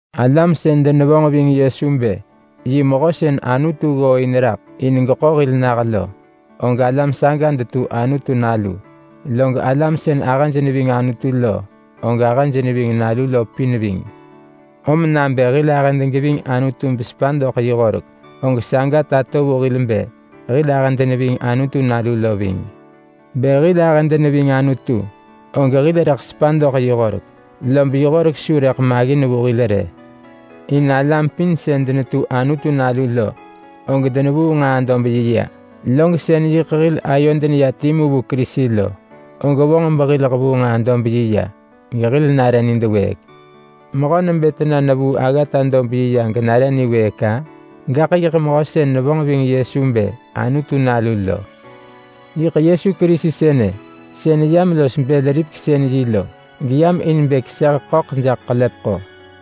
Alam sën denevonġ ving Yesu bë yi mehö sën Anutu ggooin raḳ in bë geḳo hil nah lo, og alam saga detu Anutu nalu. Log alam sën ahëj neving Anutu lo, og ahëj neving nalu lo pin ving. Om nabë hil ahëd geving Anutu besepa doḳ yi horek, og saga tato vu hil bë hil ahëd neving Anutu nalu lo ving. Bë hil ahëd neving Anutu, og hil rëḳ sepa doḳ yi horek, lob yi horek su rëḳ maggin vu hil rë. In alam pin sën denetu Anutu nalu lo, og denevuu nġaa-dob-yi ya. Log sën yiḳ hil ayod neya timu vu Kerisi lo og vonġ behil hevuu nġaa-dob-yi ya gehil nare nidwëëk. Mehö nebë tena nevuu aggata-dob-yi ya genare niwëëk-a? Gaḳ yiḳ mehö sën nevonġ ving Yesu bë Anutu Nalu lo. Yiḳ Yesu Kerisi sënë sën yam los bël-ripeksën-yi lo, geyam in bë keseh ḳöḳ jaḳ ḳelepeḳo.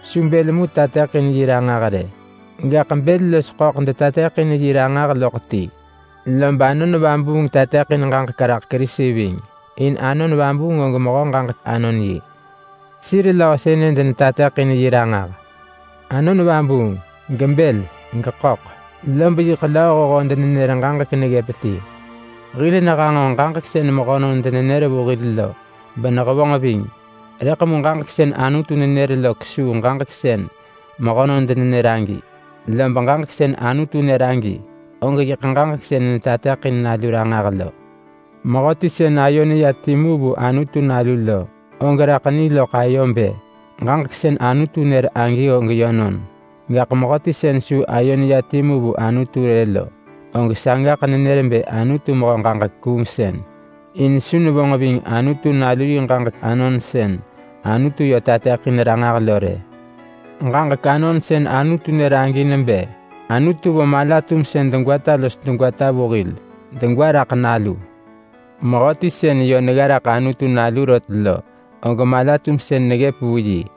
Su bël mu tateḳin yi ranġah rë, gaḳ bël los ḳöḳ detateḳin yi ranġah loḳ ti. Lob Anon Vabuung tateḳin ġaġek raḳ Kerisi ving, in Anon Vabuung og mehö ġaġek-anon-yi. Sir löö sënë denetateḳin yi ranġah: Anon Vabuung, gebël, geḳöḳ, lob yiḳ lööhoho denenër ġaġek neggëp ti. Hil nehanġo ġaġek sën mehönon denenër vu hil lo benehevonġ ving, rëḳ mu ġaġek sën Anutu nenër lo kesuu ġaġek sën mehönon denenër agi. Lob ġaġek sën Anutu nër agi, og yiḳ ġaġek sën netateḳin Nalu ranġah lo. Mehöti sën ayo neya timu vu Anutu Nalu lo, og raḳ ni loḳ ayo bë ġaġek sën Anutu nër agi og yönon. Gaḳ mehöti sën su ayo neya timu vu Anutu rë lo, og sagaḳ nenër bë Anutu mehö ġaġek-kuungsën. In su nevonġ ving Anutu Nalu yi ġaġek anon sën Anutu yö tateḳin ranġah lo rë. Ġaġek anon sën Anutu nër agi nebë: Anutu vo mala-tumsën degwata los degwata vu hil, degwa raḳ Nalu. Mehöti sën yö negga raḳ Anutu Nalu rot lo, og mala-tumsën neggëp vu yi.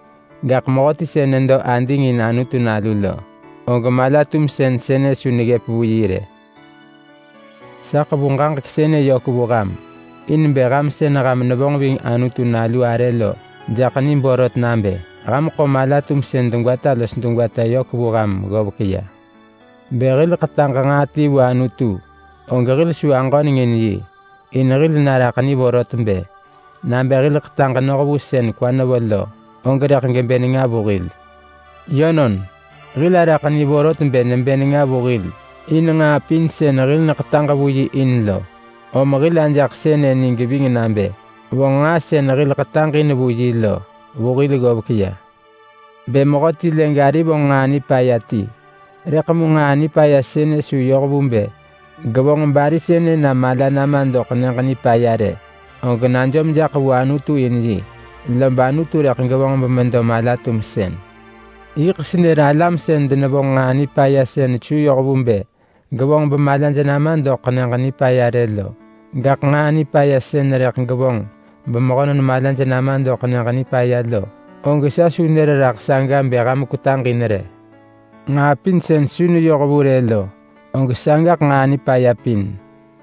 Gaḳ mehöti sën nedo ading in Anutu Nalu lo, og mala-tumsën sënë su neggëp vu yi rë. Sa ḳevu ġaġek sënë yök vu ham, in bë ham sën ham nevonġ ving Anutu Nalu arë lo jaḳ ni borot nabë ham ḳo mala-tumsën degwata los degwata yök vu ham ggovek ya. Bë hil ḳetaġ nġaa ti vu Anutu, og hil su aġöneng in yi, in hil naraḳ ni vorot bë: Nabë hil ḳetaġ noh vu sën kwa nevo lo, og rëḳ gebë nenga vu hil. Yönon, hil araḳ ni vorot bë nebë nenga vu hil in nġaa pin sën hil neḳetaġ vu yi in lo, om hil ajaḳ sënë ni geving nabë vonġ nġaa sën hil ḳetaġ in vu yi lo vu hil ggovek ya. Bë mehöti lë gari vonġ nġaa nipaya ti, rëḳ mu nġaa nipaya sënë su yoh vu bë gevonġ bari sënë na mala nama doḳ Nyëġ Nipaya rë, og najom jaḳ vu Anutu in yi, lob Anutu rëḳ gevonġ bemedo mala-tumsën. Yiḳ senër alam sën denevonġ nġaa nipaya sën su yoh vu bë gevonġ bemalaj nama doḳ Nyëġ Nipaya rë lo. Gaḳ nġaa nipaya sën rëḳ gevonġ bemehönon malaj nama doḳ Nyëġ Nipaya lo, og sa su nër raḳ saga bë ham kwetaġ in rë. Nġaa pin sën su neyoh vu rë lo, og sagaḳ nġaa nipaya pin.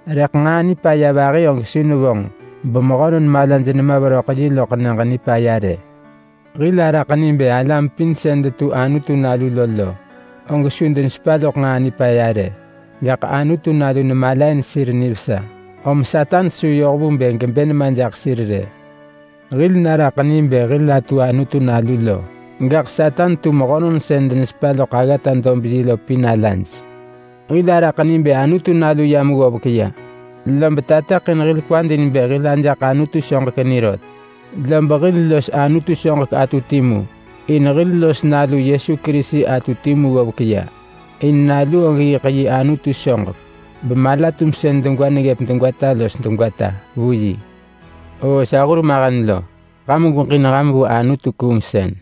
Rëḳ nġaa nipaya vahi og su nevonġ bemehönon malaj nema veröḳ yi loḳ Nyëġ Nipaya rë. Hil araḳ ni bë alam pin sën detu Anutu nalu lo, og su denesepa loḳ nġaa nipaya rë. Gaḳ Anutu Nalu nemalain sir nivesa, om Satan su yoh vu bë gebë nema jaḳ sir rë. Hil naraḳ ni bë hil atu Anutu nalu lo, gaḳ Satan tu mehönon sën denesepa loḳ aggata-dob-yi lo pin alaj. Hil araḳ ni bë Anutu Nalu yam ggovek ya, lob tateḳin hil kwad in bë hil ajaḳ Anutu soġek ni rot. Lob hil los Anutu soġek atu timu, in hil los Nalu Yesu Kerisi atu timu ggovek ya. In Nalu og yiḳ yi Anutu soġek, bemala-tumsën degwa neggëp degwata los degwata vu yi. Oo sa hurmahen lo! Ham gweġin ham vu anutu-kuungsën.